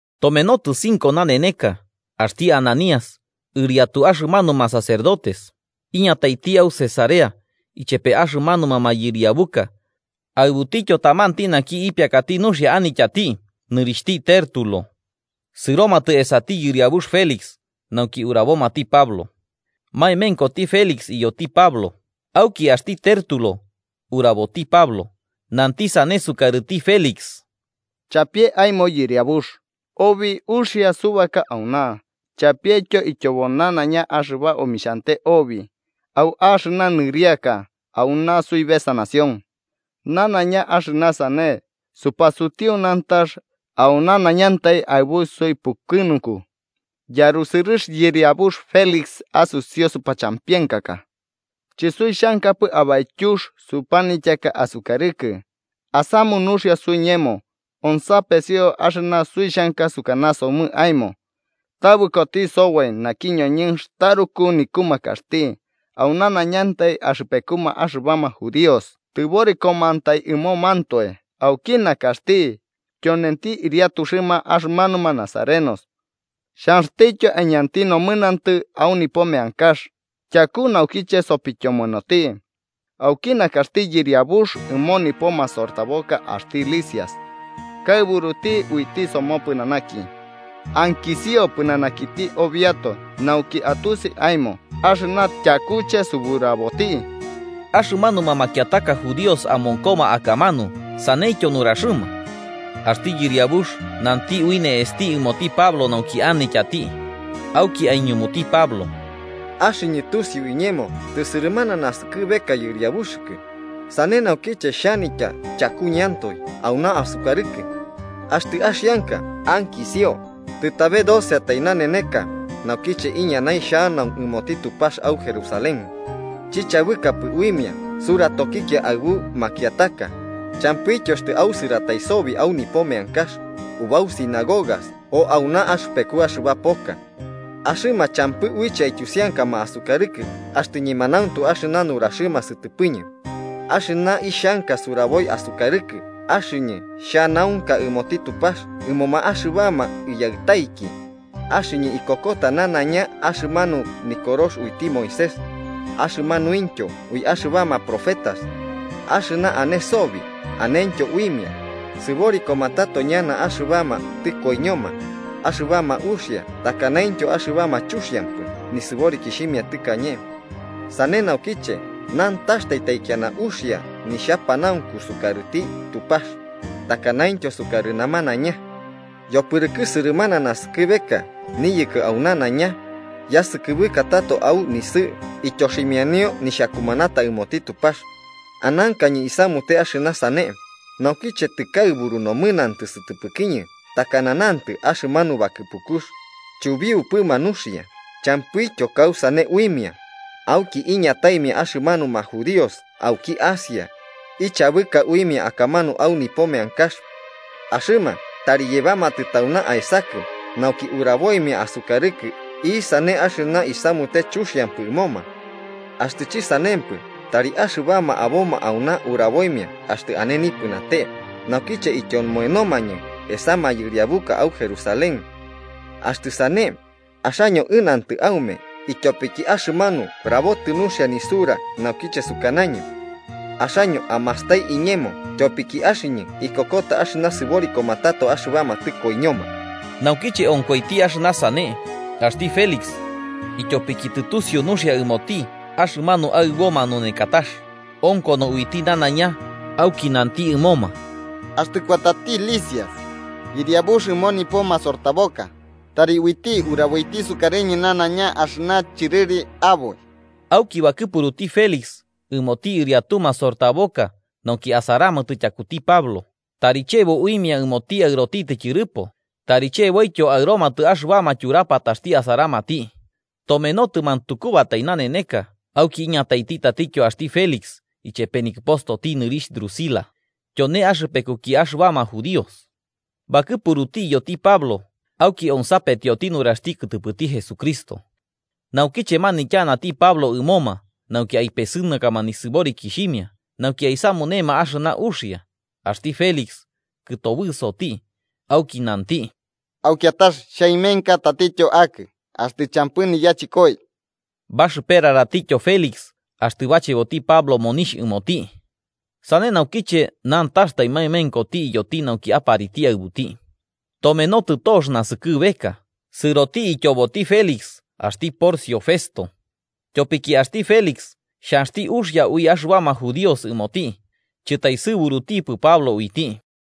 Tomenotɨ cinco naneneka, axti Ananías, ɨriatu axɨmanuma sacerdotes. Iñataiti au Cesarea ichepe axɨmanuma mayɨriabuka aɨbutityo tamanti naki ipiakati nuxia anityati nɨrixhti Tértulo. Sɨromatɨ esati yɨriabux Félix nauki urabomati Pablo. Maemenkoti Félix iyoti Pablo, auki axti Tértulo uraboti Pablo, nanti sane sukarɨti Felix: –Chapie aemo yɨriabux, obi uxia subaka auna, chapietyo ityobo nanaiña axɨba omixhante obi au axɨna nɨriaka auna suibesa nación. Nanaiña axɨna sane supasutiu nantax au nanaiñantai aɨbu suipukɨnunku, yarusɨrɨx yɨriabux Félix asusiu supachampienkaka. Chɨsuixhankapɨ abaityux supanityaka asukarɨkɨ, asamu nuxia suiñemo, onsapesio axɨna suixhanka sukanasomɨ aemo. Tabɨkoti soboi naki ñoñɨnx taruku nikumakaxti, au nanaiñantai axɨpekuma axɨbama judíos tɨborikomantai ɨmomantoe auki nakaxti, tyonenti ɨriatuxɨma axɨmanuma nazarenos. Xhanxtityo aiñanti nomɨnantɨ au nipo meankax, tyaku naukiche sopityomoenoti. Auki nakaxti yɨriabux ɨmo nipo masortaboka axti Lisias, kaɨburuti uiti somopɨnanaki. Ankisio pɨnanakiti obiatoe nauki atusi aemo axɨna tyakuche suburaboti. Axɨmanuma makiataka judíos amonkoma akamanu saneityo nuraxɨma. Axti yɨriabux nanti ui ne'esti ɨmoti Pablo nauki anityati, auki aiñumuti Pablo: –Axɨñɨ tusiu iñemo tɨsɨrɨmana naskɨbeka yɨriabuxɨkɨ, sane naukiche xhanitya chakuñɨantoe auna asukarɨkɨ. Axtɨ axianka ankisio, tɨtabe doceatai naneneka naukiche iñanai xhanau ɨmoti Tupax au Jerusalén. Chichabɨkapɨ uimia suratokikia aɨbu makiataka, champɨityo axtɨ ausɨratai sobi au nipo meankax, ubau sinagogas o auna axɨpeku axɨba poka. Axɨma champɨ uiche aityusiankama asukarɨkɨ axtɨ ñemanauntu axɨna nuraxɨma sɨtɨpɨñɨ. Axɨna ixhanka suraboi asukarɨkɨ axɨñɨ xhanaunka ɨmoti Tupax ɨmoma axɨbama iyaɨtaiki. Axɨñɨ ikokota nanaiña axɨmanu Nikorox uiti Moisés, axɨmanuintyo ui axɨbama profetas. Axɨna ane sobi, anentyo uimia, sɨborikoma tato ñana axɨbama tɨkoiñoma, axɨbama uxia takanaintyo axɨbama chuxiampɨ nisɨborikixhimia tɨkañe. Sane naukiche nantax taikiana uxia nixhapanaunku sukarɨti Tupax takanaintyo sukarɨ namanaiña. Yopɨrɨkɨ sɨrɨmana naskɨbeka niyɨkɨ au nanaiña, yasɨkɨbɨka tato au nisɨ'ɨ ityoximianio nixhakumanata ɨmoti Tupax. Anankañɨ isamute axɨna sane, naukiche tɨkaɨburu nomɨnantɨ sɨtɨpɨkiñɨ takana nantɨ axɨmanu bakɨpukux, chubiupɨma nuxia champɨityo kausane uimia, auki iñataimia axɨmanuma judíos auki Asia, ichabɨka uimia akamanu au nipo meankax. Axɨma tari yebamatɨ tauna aesakɨ nauki uraboimia asukarɨkɨ isane axɨna isamute chuxiampɨ ɨmoma. Axtɨ chisanempɨ tari axɨbama aboma auna uraboimia axtɨ ane nipɨnate, naukiche ityomonomañɨ esa mayɨriabuka au Jerusalén. Axtɨ sane, axaño ɨnantɨ aume ityopiki axɨmanu rabotɨ nuxia nisura naukiche sukanañɨ: ‘Axaño amastai iñemo tyopiki axɨñɨ ikokota axɨna sɨborikoma tato axɨbama tɨkoiñoma.’” Naukiche onkoiti axɨna sane, axti Félix, ityopiki tɨtusiu nuxia ɨmoti axɨmanu Aɨbo manunekatax, onkono uiti nanaiña, auki nanti ɨmoma: –Axtɨ kuatati Lisias yɨriabux ɨmo nipo masortaboka, tari uiti uraboiti sukarɨñɨ nanaiña axɨna chɨrɨri aboi. Auki bakɨpuruti Félix ɨmoti ɨriatu masortaboka, nauki asaramatɨ tyakuti Pablo, tari chebo uimia ɨmoti aɨrotitɨ tyɨrɨpo tari cheboityo aɨromatɨ axɨbama tyurapataxti asaparamati. Tomenotɨ mantukubatai naneneka, auki iñataiti tatityo axti Félix ichepe nikɨpostoti nɨrixh Drusila, tyone axɨpekuki axɨbama judíos. Bakɨpuruti iyoti Pablo, auki onsapetioti nuraxti kɨtɨpɨti Jesucristo. Naukiche manityanati Pablo ɨmoma nauki aipesɨnakama nisɨborikixhimia nauki aisamunema axɨna uxia, axti Félix kɨtobɨsoti auki nanti: –Au kiatax xhaemenka tatityo akɨ axtɨ champɨ niyachɨkoi. Baxɨperaratityo Félix axtɨ bacheboti Pablo monixh ɨmoti. Sane naukiche nantaxtai maemenkoti iyoti nauki apariti aɨbuti. Tomenotɨ tox naskɨbeka, sɨroti ityoboti Félix axti Porcio Festo. Tyopiki axti Félix xhanxti uxia ui axɨbama judíos ɨmoti, chɨtaesɨburutipɨ Pablo uiti.